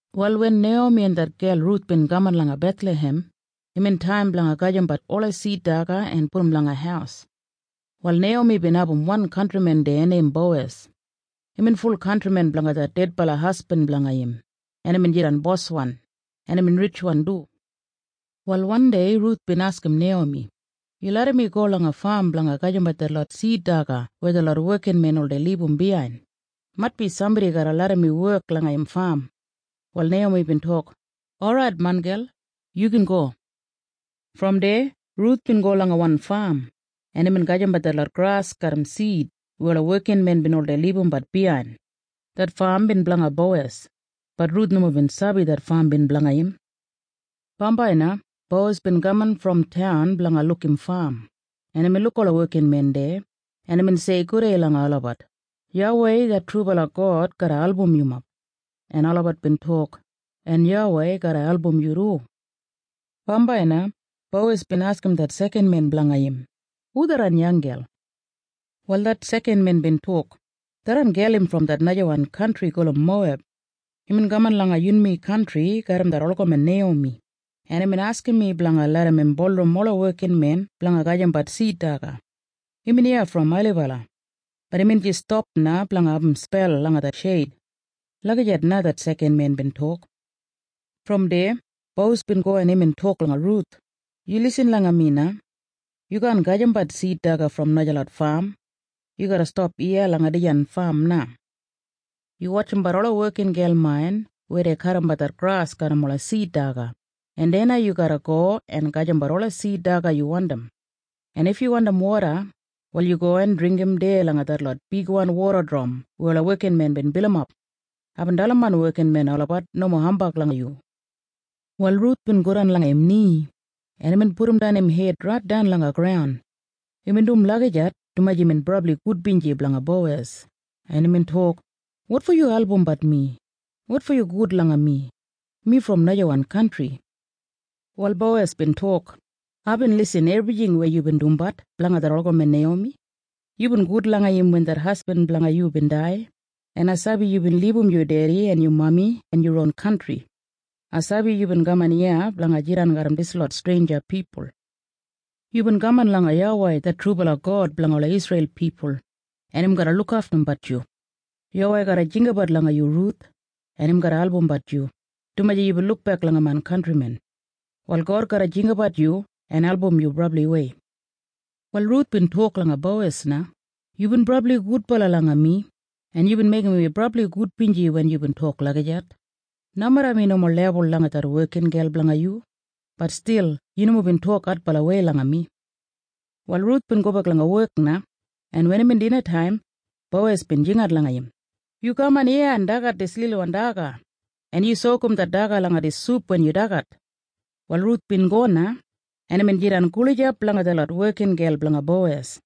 Wal wen Neiyomi en det gel Ruth bin kaman langa Bethlahem, imbin taim blanga gajimbat ola sid daga en pudum langa haus. Wal Neiyomi bin abum wan kantrimen deya neim Bowes. Imbin ful kantrimen blanga det dedbala hasbin blanga im, en imbin jidan boswan, en imbin ritjwan du. Wal wandei Ruth bin askim Neiyomi, “Yu larram mi go langa fam blanga gajimbat detlot sid daga weya detlot wekinmen oldei libum biyain. Maitbi sambodi garra larram mi wek langa im fam.” Wal Neiyomi bin tok, “Orait, main gel. Yu gin go.” Brom deya Ruth bin go langa wan fam, en imbin gajimbat detlot gras garram sid weya ola wekinmen bin oldei libumbat biyain. Det fam bin blanga Bowes. Bat Ruth nomo bin sabi det fam bin blanga im. Bambai na Bowes bin kaman brom taun blanga luk im fam, en imbin luk ola wekinmen deya, en imbin sei gudei langa olabat, “YAWEI det trubala God garra album yumob.” En olabat bin tok, “En YAWEI garra album yu du.” Bambai na Bowes bin askim det sekanwan bos blanga im, “Hu tharran yanggel?” Wal det sekanwan men bin tok, “Im det gel brom det najawan kantri gulum Moweb. Imbin kaman langa yunmi kantri garram det olgamen Neiyomi, en imbin askim mi blanga larram im bulurrum ola wekinmen blanga gajimbat sid daga. Imbin iya brom ailibala. Bat imbin jis stap na blanga abum spel langa det sheid.” Lagijat na det sekanmen bin tok. Brom deya Bowes bin go en imbin tok langa Ruth, “Yu lisin langa mi na. Yu kaan gajimbat sid daga brom najalot fam. Yu garra stap iya langa main fam na. Yu wotjimbat ola wekingel main weya dei kadimbat det gras garram ola sid daga, en deya na yu garra go en gajimbat ola sid daga yu wandim. En if yu wandim woda, wal yu go en dringgim deya langa detlot bigwan woda dram weya ola wekinmen bin bilimap. Aibin dalim main wekinmen olabat nomo hambag langa yu.” Wal Ruth bin godan langa im ni, en imbin pudumdan im hed raitdan langa graun. Imbin dum lagijat dumaji imbin brabli gudbinji blanga Bowes, en imbin tok, “Wotfo yu albumbat mi? Wotfo yu gud langa mi? Mi brom najawan kantri.” Wal Bowes bin tok, “Aibin lisin ebrijing weya yubin dumbat blanga det olgamen Neiyomi. Yubin gud langa im wen det hasbin blanga yu bin dai, en ai sabi yubin libum yu dedi en yu mami en yu ron kantri. Ai sabi yubin kaman iya blanga jidan garram dislot streinja pipul. Yubin kaman langa YAWEI det trubala God blanga ola Isreil pipul, en im garra lukaftumbat yu. YAWEI garra jinggabat langa yu, Ruth, en im garra albumbat yu, dumaji yubin lukbek langa main kantrimen. Wal God garra jinggabat yu en album yu brabliwei.” Wal Ruth bin tok langa Bowes na, “Yubin brabli gudbala langa mi, en yubin meigim mi brabli gudbinji wen yubin tok lagijat. Nomeda mi nomo lebul langa detlot wekingel blanga yu, bat stil yu nomo bin tok adbalawei langa mi.” Wal Ruth bin gobek langa wek im na, en wen imbin dinataim, Bowes bin jingat langa im, “Yu kaman iya en dagat dis lilwan daga, en yu sokum det daga langa dis sup wen yu dagat.” Wal Ruth bin go na, en imbin jidan gulijap langa detlot wekingel blanga Bowes,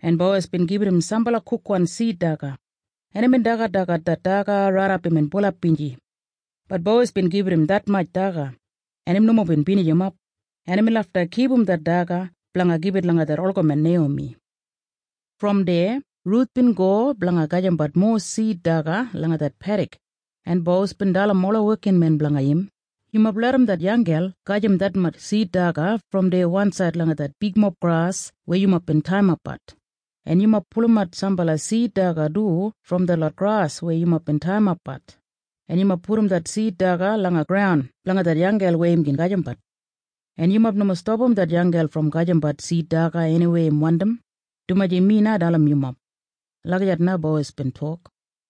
en Bowes bin gibit im sambala kukwan sid daga, en imbin dagadagat det daga raidap imbin bulap binji. Bat Bowes bin gibit im detmatj daga, en im nomo bin binijimap, en imbin lafta kipum det daga blanga gibit langa det olgamen Neiyomi. Brom deya Ruth bin go blanga gajimbat mowa sid daga langa det pedik, en Bowes bin dalim ola wekinmen blanga im, “Yumob larram det yanggel gajim detmatj sid daga brom deya wansaid langa det bigmob gras weya yumob bin taiyimapbat. En yumob pulumat sambala sid daga du brom detlot gras weya yumob bin taiyimapbat, en yumob pudum det sid daga langa graun blanga det yanggel weya im gin gajimbat. En yumob nomo stapam det yanggel brom gajimbat sid daga eniweya im wandim, dumaji mi na dalim yumob.” Lagijat na Bowes bin tok.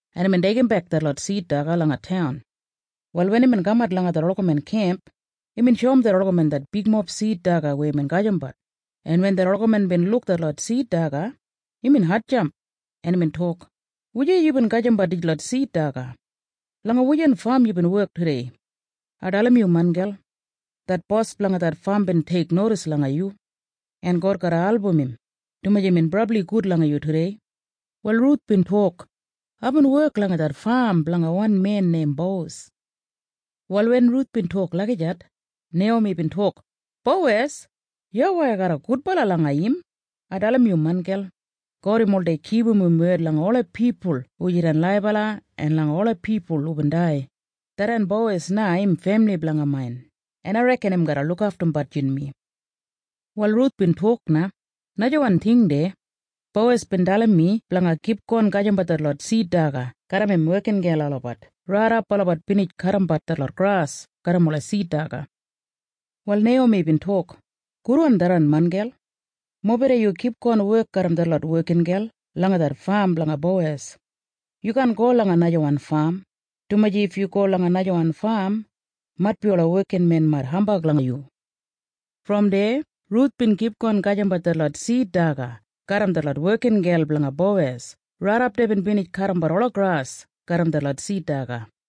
en imbin deigimbek detlot sid daga langa taun. Wal wen imbin kamat langa det olgamen kemp, imbin shoum det olgamen det bigmob sid daga weya imbin gajimbat, en wen det olgamen bin luk detlot sid daga, imbin hatjamp, en imbin tok, “Wujei yubin gajimbat dislot sid daga? Langa wujan fam yubin wek tudei? Ai dalim yu, main gel. Det bos blanga det fam bin teiknodis langa yu. En God garra album im, dumaji imbin brabli gud langa yu tudei.” Wal Ruth bin tok, “Aibin wek langa det fam blanga wan men neim Bowes.” Wal wen Ruth bin tok lagijat, Neiyomi bin tok, “Bowes! YAWEI garra gudbala langa im. Ai dalim yu, main gel. God im oldei kipum im wed langa ola pipul hu jidan laibala en langa ola pipul hubin dai. Tharran Bowes na im femili blanga main, en ai reken im garra lukaftumbat yunmi.” Wal Ruth bin tok na, “Najawan ting deya. Bowes bin dalim mi blanga kipgon gajimbat detlot sid daga garram im wekingel olabat raidap olabat binij kadimbat detlot gras garram ola sid daga.” Wal Neiyomi bin tok, “Gudwan tharran, main gel. Mobeda yu kipgon wek garram detlot wekingel langa det fam blanga Bowes. Yu kaan go langa najawan fam, dumaji if yu go langa najawan fam, maitbi ola wekinmen mait hambag langa yu.” Brom deya Ruth bin kipgon gajimbat detlot sid daga garram detlot wekingel blanga Bowes raidap deibin binijimap det wek.